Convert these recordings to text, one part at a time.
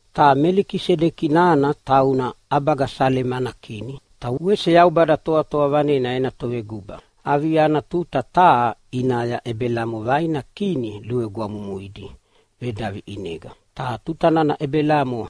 Ta Melikisedeki nana tauna ʼabaga Salema ana kini ta wese Yaubada Toatoa Vanena ena toveguba. Avia ana tuta taha ʼinaya Ebelamo vaina kini luvegwamumuidi vedavi ʼinega. Ta tuta nana Ebelamo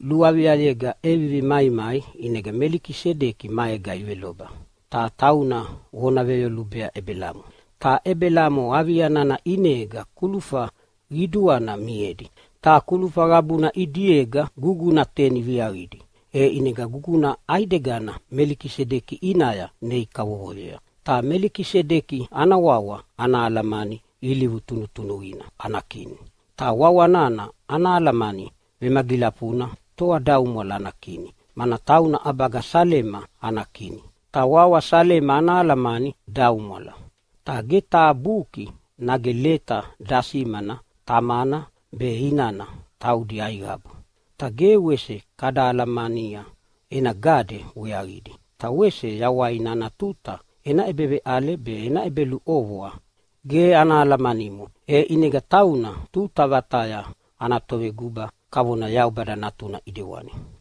luaviayega ʼevivi maimai ʼinega Melikisedeki maega iveloba, ta tauna vona veyolubea Ebelamo. Ta Ebelamo avia nana ʼinega kulufa qiduana miedi. Ta kulufa qabuna ʼidiega guguna teni viaqidi, e ʼinega guguna ʼaidegana Melikisedeki ʼinaya nei kavovoyea. Ta Melikisedeki ana wawa ana alamani “Ilivu tunutunuqina ana kini.” Ta wawa nana ana alamani vemagilafuna, “Toadaumwala ana kini”, mana tauna ʼabaga Salema ana kini, ta wawa Salema ana alamani “Daumwala”. Ta ge taha buki nage leta dasimana tamana be inana taudi aiqabu, ta ge wese kada alamania ena gade weaqidi. Ta wese yawaina ana tuta ena ʼebeveʼale be ena ʼebeluʼovoa ge ana alamanimo. E ʼinega tauna tuta vataya ana toveguba kavona Yaubada Natuna ʼidewani.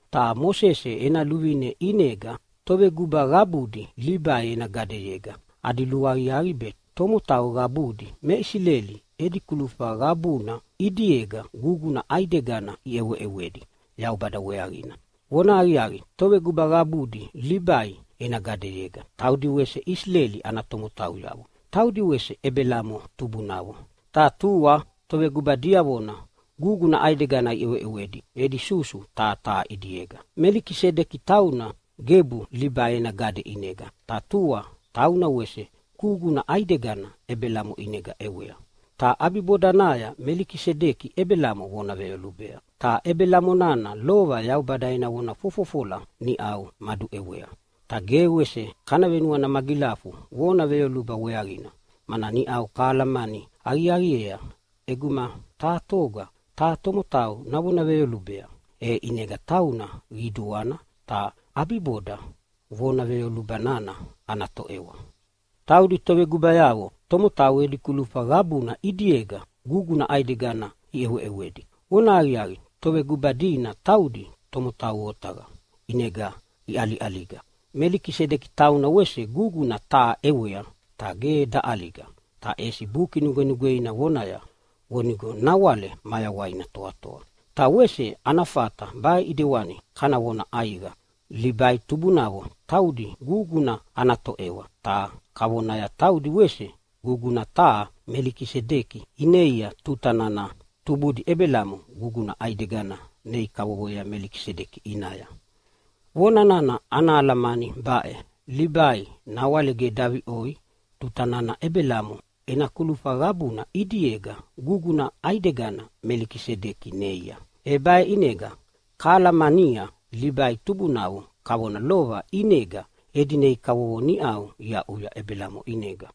Ta Mosese ena luvine ʼinega toveguba qabudi Libai ena gadeyega adi luaqiaqi be tomotau qabudi me Isileli edi kulufa qabuna ʼidiega guguna ʼaidegana iʼeweʼewedi Yaubada weaqina. Vonahaqiaqi, toveguba qabudi Libai ena gadeyega taudi wese Isileli ana tomotauyavo. Taudi wese Ebelamo tubunavo, ta tua toveguba diavona guguna ʼaidegana iʼeweʼewedi edi susu taha taha ʼidiega. Melikisedeki tauna gebu Libai ena gade ʼinega, ta tua tauna wese guguna ʼaidegana Ebelamo ʼinega ʼewea. Ta ʼabibodanaya Melikisedeki Ebelamo vona veyolubea, ta Ebelamo nana lova Yaubada ena vona fofofola niʼau maduʼewea. Ta ge wese kana venuana magilafu vona veyoluba weaqina, mana niʼau kahalamani aqiaqiea ʼeguma taha toga taha tomotau navona veyolubea, e ʼinega tauna qiduana, ta ʼabiboda vona veyoluba nana ana toʼewa. Taudi tovegubayavo tomotau edi kulufa qabuna ʼidiega guguna ʼaidegana iʼeweʼewedi. Vonahaqiaqi, toveguba dina taudi tomotau otaqa ʼinega iʼaliʼaliga. Melikisedeki tauna wese guguna taha ʼewea, ta ge daʼaliga, ta ʼesi Buki Nugwenugweina vonaya vonigo nawale mayawaina toatoa. Ta wese ana fata baʼe ʼidewani kana vona ʼaiqa: Libai tubunavo taudi guguna ana toʼewa, ta kavonaya taudi wese guguna taha Melikisedeki ineia tuta nana tubudi Ebelamo guguna ʼaidegana nei kavovoyea Melikisedeki ʼinaya. Vona nana ana alamani baʼe: Libai nawale ge daviʼoi tuta nana Ebelamo ena kulufa qabuna ʼidiega guguna ʼaidegana Melikisedeki neia. E baʼe ʼinega kahalamania Libai tubunavo kavona lova ʼinega edi nei kavovo niʼa iaʼuya Ebelamo ʼinega.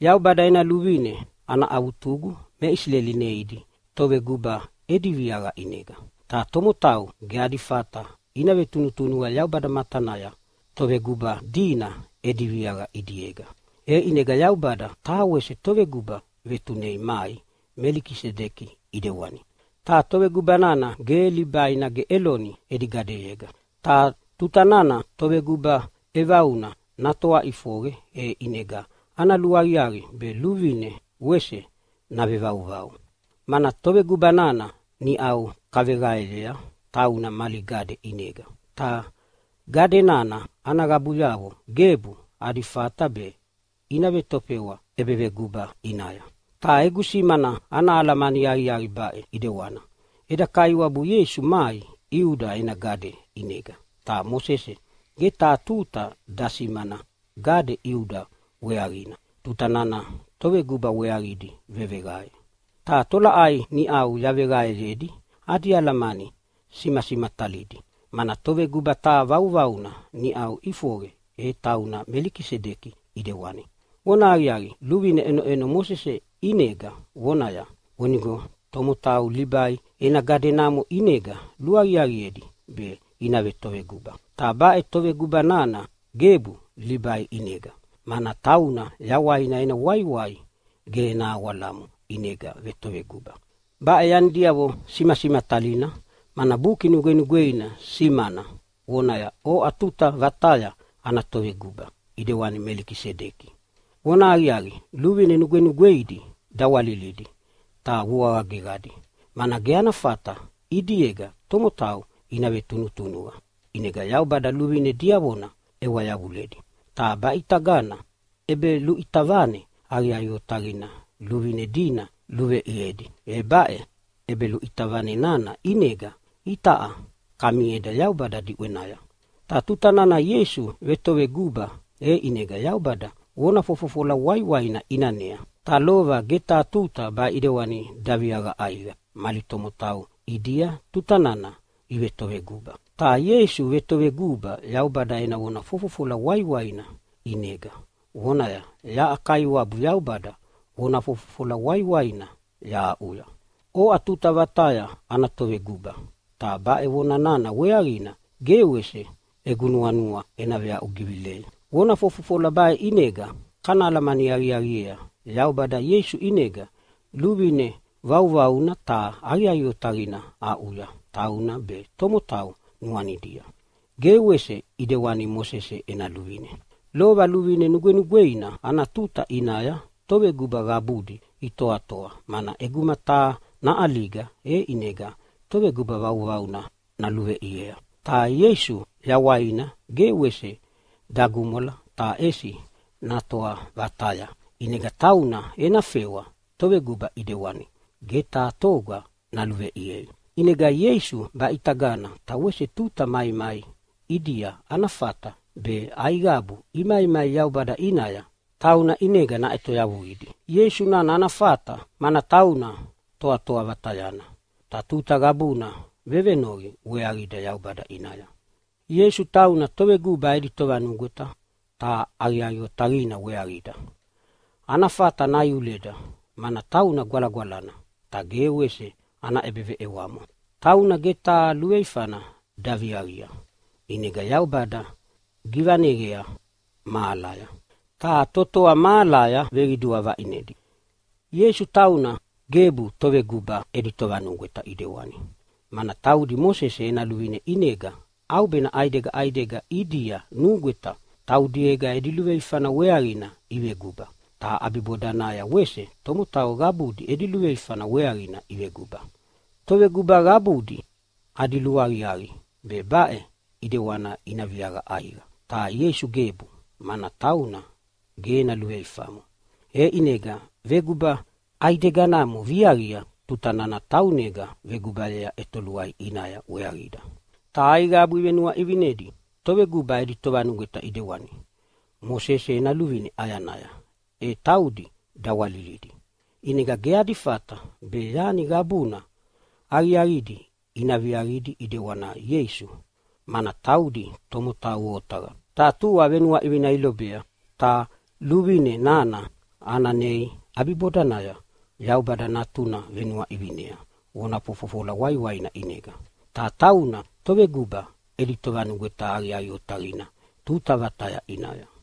Yaubada ena luvine ana avutugu me Isileli neidi toveguba edi viaqa ʼinega. Ta tomotau ge adi fata ina vetunutunuqa Yaubada matanaya toveguba dina edi viaqa ʼidiega, e ʼinega Yaubada taha wese toveguba vetunei mai Melikisedeki ʼidewani, ta toveguba nana ge Libai nage Eloni edi gadeyega. Ta tuta nana toveguba ʼevauna natoa ʼifoqe, e ʼinega ana luaqiaqi be luvine wese navevauvau. Mana toveguba nana niʼau kaveqaeyea tauna mali gade ʼinega, ta gade nana ana qabuyavo gebu adi fata be ina vetofewa ʼebeveguba ʼinaya. Ta egu simana ana alamani aqiaqi baʼe ʼidewani: Eda Kaiwabu Ieisu mai Iuda ena gade ʼinega, ta Mosese ge taha tuta dasimana gade Iuda weaqina tuta nana toveguba weaqidi veveqae. Ta tolaʼai niʼau yaveqaeyedi adi alamani simasimatalidi, mana toveguba taha vauvauna niʼau ʼifoqe, e tauna Melikisedeki ʼidewani. Vonahaqiaqi, luvine ʼenoʼeno Mosese ʼinega vonaya vonigo tomotau Libai ena gade namo ʼinega luaqiaqiedi be ina vetoveguba. Ta baʼe toveguba nana gebu Libai ʼinega, mana tauna yawaina ena waiwai ge ena awalamo ʼinega vetoveguba. Baʼe yanidiavo simasimatalina, mana Buki Nugwenugweina simana vonaya, “Oʼa tuta vataya ana toveguba ʼidewani Melikisedeki.” Vonahaqiaqi, luvine nugwenugweidi dawalilidi ta vuaqa geqadi, mana ge ana fata ʼidiega tomotau ina vetunutunuqa, ʼinega Yaubada luvine diavona ʼewa yavuledi. Ta baʼitagana ʼebeluʼita vane aqiaqi otaqina luvine dina luveʼiedi, e baʼe ʼebeluʼita vane nana ʼinega itaʼa kamieda Yaubada diʼwenaya. Ta tuta nana Ieisu vetoveguba e ʼinega Yaubada vona fofofola waiwaina ʼinanea, ta lova ge taha tuta baʼe ʼidewani daviaqa ʼaiqa mali tomotau ʼidia tuta nana ivetoveguba. Ta Ieisu vetoveguba Yaubada ena vona fofofola waiwaina ʼinega, vonaya, “Yaʼa Kaiwabu Yaubada vona fofofola waiwaina yahaʼuya, ‘Oʼa tuta vataya ana toveguba.’ Ta baʼe vona nana weaqina ge wese egu nuanua ena veaʼugivilei.” Vona fofofola baʼe ʼinega kana alamani aqiaqiea Yaubada Ieisu ʼinega luvine vauvauna ta aqiaqi otaqina aʼuya tauna be tomotau nuanidia, ge wese ʼidewani Mosese ena luvine. Lova luvine nugwenugweina ana tuta ʼinaya toveguba qabudi itoatoa, mana ʼeguma taha naʼaliga e ʼinega toveguba vauvauna naluveʼiea. Ta Ieisu yawaina ge wese dagumwala ta ʼesi natoa vataya, ʼinega tauna ena fewa toveguba ʼidewani ge taha toga naluveʼiei. ʼInega Ieisu baʼitagana ta wese tuta maimai ʼidia ana fata be aiqabu imaimai Yaubada ʼinaya tauna ʼinega naʼetoyavuidi. Ieisu nana ana fata, mana tauna Toatoa Vatayana ta tuta qabuna vevenoqi weaqida Yaubada ʼinaya. Ieisu tauna Toveguba edi Tovanugweta ta aqiaqi otaqina weaqida. Ana fata naiuleda, mana tauna gwalagwalana ta ge wese ana ʼebeveʼewamo. Tauna ge taha luveifana daviaqia, ʼinega Yaubada givaneqea mahalaya, ta totoa mahalaya veqidua vaʼinedi. Ieisu tauna gebu toveguba edi tovanugweta ʼidewani, mana taudi Mosese ena luvine ʼinega ʼaubena ʼaidega ʼaidega ʼidia nugweta taudiega edi luveifana weaqina iveguba, ta ʼabibodanaya wese tomotau qabudi edi luveifana weaqina iveguba. Toveguba qabudi adi luaqiaqi be baʼe ʼidewani ina viaqa ʼaiqa. Ta Ieisu gebu, mana tauna ge ena luveifamo, e ʼinega veguba ʼaideganamo viaqia tuta nana taunega vegubayea ʼetoluai ʼinaya weaqida. Ta aiqabu ivenuaʼivinedi toveguba edi tovanugweta ʼidewani Mosese ena luvine ʼayanaya e taudi dawalilidi, ʼinega ge adi fata be yani qabuna aqiaqidi ina viaqidi ʼidewani Ieisu, mana taudi tomotau otaqa, ta tua venuaʼivina ilobea. Ta luvine nana ana nei ʼabibodanaya Yaubada Natuna venuaʼivinea vona fofofola waiwaina ʼinega. Ta tauna Toveguba edi Tovanugweta aqiaqi otaqina tuta vataya ʼinaya.